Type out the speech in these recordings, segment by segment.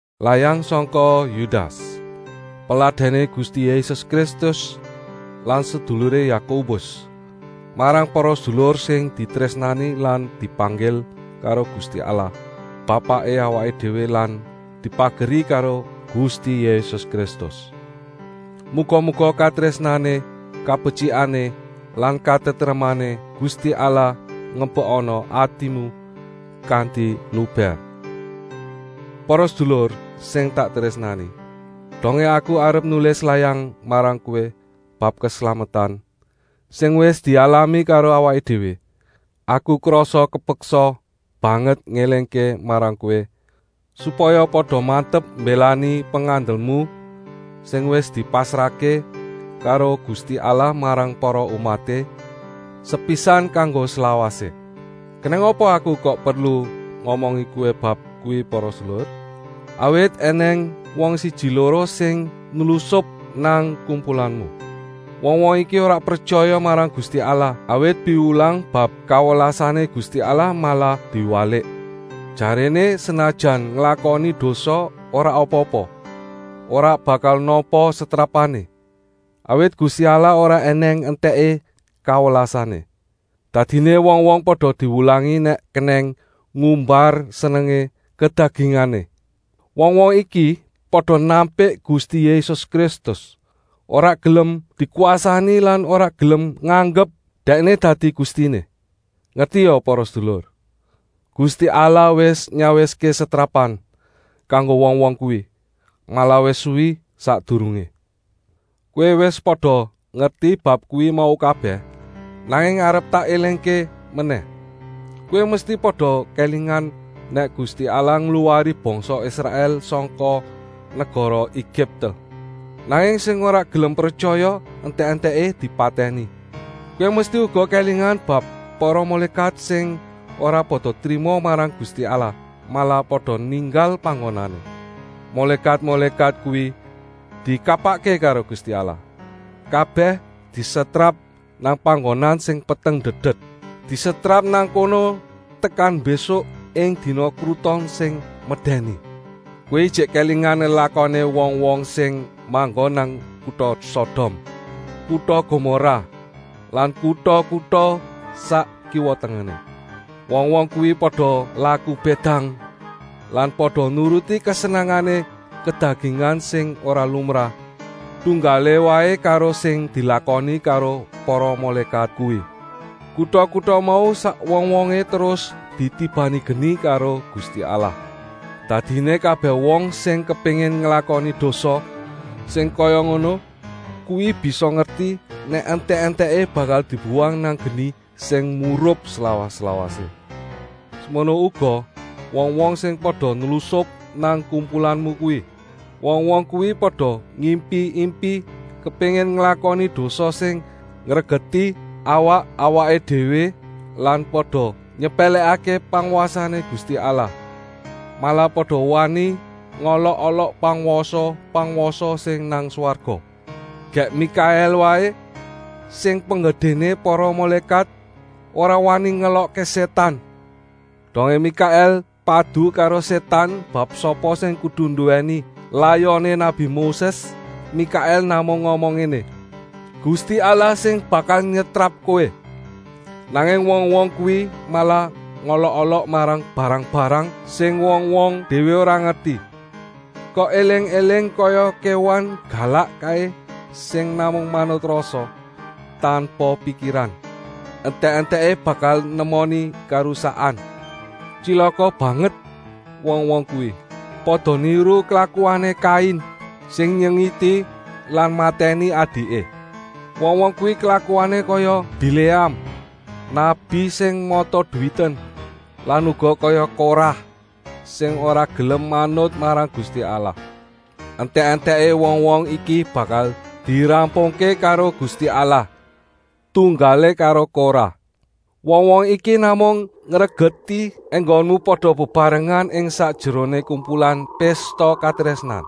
Layang sangka Yudas, peladèné Gusti Yésus Kristus lan seduluré Yakobus, marang para sedulur sing ditrésnani lan dipanggil karo Gusti Allah Bapaké awaké déwé lan dipageri karo Gusti Yésus Kristus. Muga-muga katrésnané, kabetyikané lan katentremané Gusti Allah ngebekana atimu kanti lubèr. Para sedulur sing tak trésnani, dongé aku arep nulis layang marang kowé bab keslametan sing wis dialami karo awaké déwé, aku krasa kepeksa banget ngélingké marang kowé, supaya pada mantep mbélani pengandelmu, sing wis dipasrahké karo Gusti Allah marang para umaté, sepisan kanggo slawasé. Kenèng apa aku kok perlu ngomongi kowé bab kuwi para sedulur? Awit ènèng wong siji-loro sing nlusup nang kumpulanmu. Wong-wong iki ora pretyaya marang Gusti Allah, awit piwulang bab kawelasané Gusti Allah malah diwalik. Jaréné senajan nglakoni dosa ora apa-apa, ora bakal nampa setrapané, awit Gusti Allah ora ènèng entèké kawelasané. Dadiné wong-wong pada diwulangi nèk kenèng ngumbar senengé kedagingané. Wong-wong iki pada nampik Gusti Yésus Kristus, ora gelem dikwasani lan ora gelem nganggep Dèkné dadi Gustiné. Ngertia para sedulur, Gusti Allah wis nyawiské setrapan kanggo wong-wong kuwi, malah wis suwi sakdurungé. Kowé wis pada ngerti bab kuwi mau kabèh, nanging arep tak élingké menèh. Kowé mesti pada kélingan nèk Gusti Allah ngluwari bangsa Israèl sangka negara Egipte. Nanging sing ora gelem pretyaya entèk-entèké dipatèni. Kowé mesti uga kélingan bab para mulékat sing ora pada trima marang Gusti Allah, malah pada ninggal panggonané. Mulékat-mulékat kuwi dikapakké karo Gusti Allah? Kabèh disetrap nang panggonan sing peteng ndedet. Disetrap nang kono tekan mbésuk ing dina kruton sing medèni. Kowé ijik kélingan lelakoné wong-wong sing manggon nang kuta Sodom, kuta Gomorah lan kuta-kuta sak kiwa-tengené? Wong-wong kuwi pada laku bédang lan pada nuruti kesenengané kedagingan sing ora lumrah, tunggalé waé karo sing dilakoni karo para mulékat kuwi. Kuta-kuta mau sak wong-wongé terus ditibani geni karo Gusti Allah. Dadiné kabèh wong sing kepéngin nglakoni dosa sing kaya ngono kuwi bisa ngerti, nèk entèk-entèké bakal dibuwang nang geni sing murup slawas-lawasé. Semono uga wong-wong sing pada nlusup nang kumpulanmu kuwi. Wong-wong kuwi pada ngimpi-impi kepéngin nglakoni dosa sing ngregeti awak-awaké déwé lan pada nyepèlèkké pangwasané Gusti Allah. Malah pada wani ngolok-olok pangwasa-pangwasa sing nang swarga. Gèk Mikaèl waé, sing penggedéné para mulékat, ora wani ngelokké Sétan. Dongé Mikaèl padu karo Sétan bab sapa sing kudu nduwèni layoné nabi Moses, Mikaèl namung ngomong ngéné: “Gusti Allah sing bakal nyetrap kowé!” Nanging wong-wong kuwi malah ngolok-olok marang barang-barang sing wong-wong déwé ora ngerti. Kok éling-éling kaya kéwan galak kaé sing namung manut rasa, tanpa pikiran. Entèk-entèké bakal nemoni karusakan. Tyilaka banget wong-wong kuwi! Pada niru klakuané Kain, sing nyengiti lan matèni adiké. Wong-wong kuwi klakuané kaya Biléam, nabi sing mata-duwiten lan uga kaya Korah, sing ora gelem manut marang Gusti Allah. Entèk-entèké wong-wong iki bakal dirampungké karo Gusti Allah, tunggalé karo Korah. Wong-wong iki namung ngregeti enggonmu pada bebarengan ing sakjeroné kumpulan pésta katrésnan.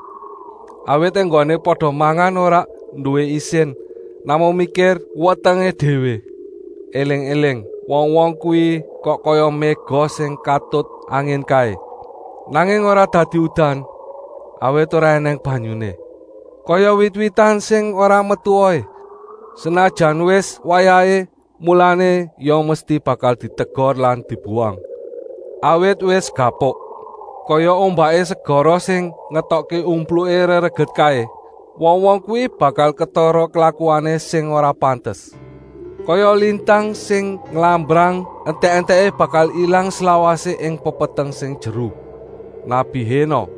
Awit enggoné pada mangan ora nduwé isin, namung mikir wetengé déwé. Eling-éling wong-wong kuwi kok kaya méga sing katut angin kaé, nanging ora dadi udan, awit ora ènèng banyuné. Kaya wit-witan sing ora metu wohé, senajan wis wayahé, mulané ya mesti bakal ditegor lan dibuwang, awit wis gapuk. Kaya ombaké segara sing ngetokké umpluké rereget kaé, wong-wong kuwi bakal ketara klakuané sing ora pantes. Kaya lintang sing nglambrang, entèk-entèké bakal ilang slawasé ing pepeteng sing jeru. Nabi Hénok,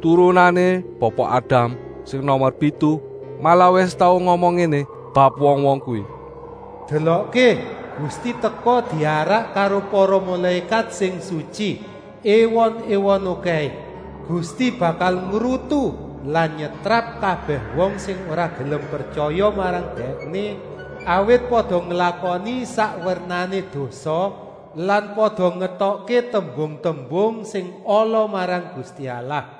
turunané Bapa Adam sing nomer pitu, malah wis tau ngomong ngéné bab wong-wong kuwi: “Delokké, Gusti teka diarak karo para mulékat sing sutyi, èwon-èwon okèhé. Gusti bakal ngrutu lan nyetrap kabèh wong sing ora gelem pretyaya marang Dèkné, awit pada nglakoni sak wernané dosa lan pada ngetokké tembung-tembung sing ala marang Gusti Allah.”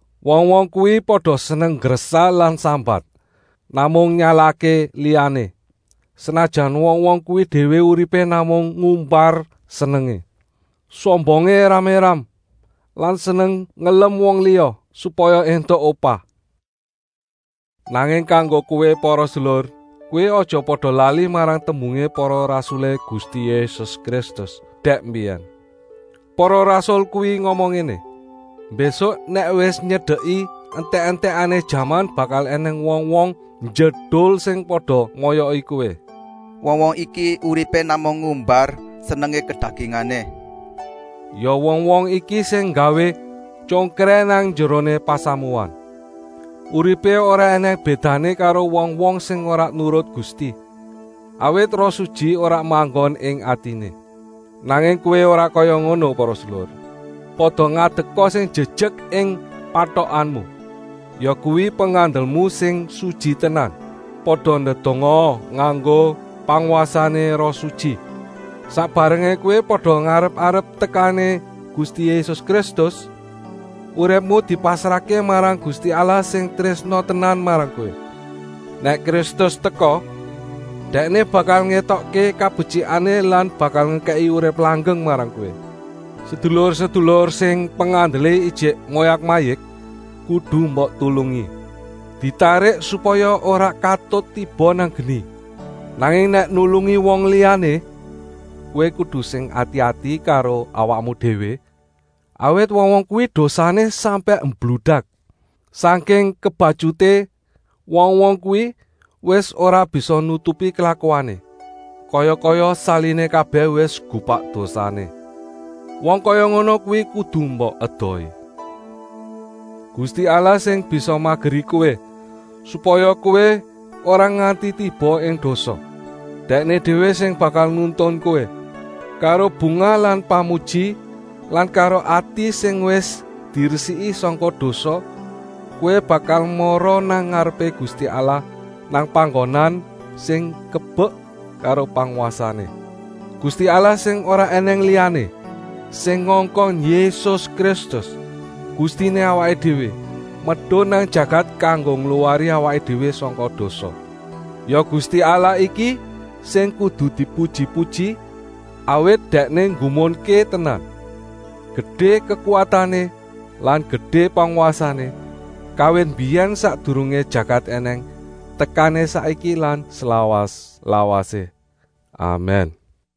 Wong-wong kuwi pada seneng nggresah lan sambat, namung nyalahké liyané, senajan wong-wong kuwi déwé uripé namung ngumbar senengé. Sombongé éram-éram lan seneng ngelem wong liya, supaya éntuk upah. Nanging kanggo kowé para sedulur, kowé aja pada lali marang tembungé para rasulé Gusti Yésus Kristus dèk mbiyèn. Para rasul kuwi ngomong ngéné: “Mbésuk nèk wis nyedeki entèk-entèkané jaman bakal ènèng wong-wong njedul sing pada moyoki kowé. Wong-wong iki uripé namung ngumbar senengé kedagingané.” Ya wong-wong iki sing nggawé tyongkrèh nang njeroné pasamuan. Uripé ora ènèng bédané karo wong-wong sing ora nurut Gusti, awit Roh Sutyi ora manggon ing atiné. Nanging kowé ora kaya ngono para sedulur. Pada ngadeka sing jejek ing patokanmu, yakuwi pengandelmu sing sutyi tenan. Pada ndedongaa nganggo pangwasané Roh Sutyi. Sak barengé kowé pada ngarep-arep tekané Gusti Yésus Kristus, uripmu dipasrahké marang Gusti Allah sing trésna tenan marang kowé. Nèk Kristus teka, Dèkné bakal ngétokké kabetyikané lan bakal ngekèki urip langgeng marang kowé. Sedulur-sedulur sing pengandelé ijik moyak-mayik kudu mbok tulungi. Ditarik supaya ora katut tiba nang geni. Nanging nèk nulungi wong liyané kowé kudu sing ati-ati karo awakmu déwé, awit wong-wong kuwi dosané sampèk mbludak. Sangking kebatyuté wong-wong kuwi wis ora bisa nutupi klakuané, kaya-kaya saliné kabèh wis gupak dosané. Wong kaya ngono kuwi kudu mbok edohi. Gusti Allah sing bisa mageri kowé, supaya kowé ora nganti tiba ing dosa, Dèkné déwé sing bakal nuntun kowé. Karo bungah lan pamuji lan karo ati sing wis diresiki sangka dosa kowé bakal mara nang ngarepé Gusti Allah, nang panggonan sing kebek karo pangwasané. Gusti Allah sing ora ènèng liyané, sing ngongkon Yésus Kristus, Gustiné awaké déwé, medun nang jagat kanggo ngluwari awaké déwé sangka dosa. Ya Gusti Allah iki sing kudu dipuji-puji, awit Dèkné nggumunké tenan, gedé kekuwatané lan gedé pangwasané, kawit mbiyèn sakdurungé jagat ènèng tekané saiki lan slawas-lawasé. Amèn. Yudas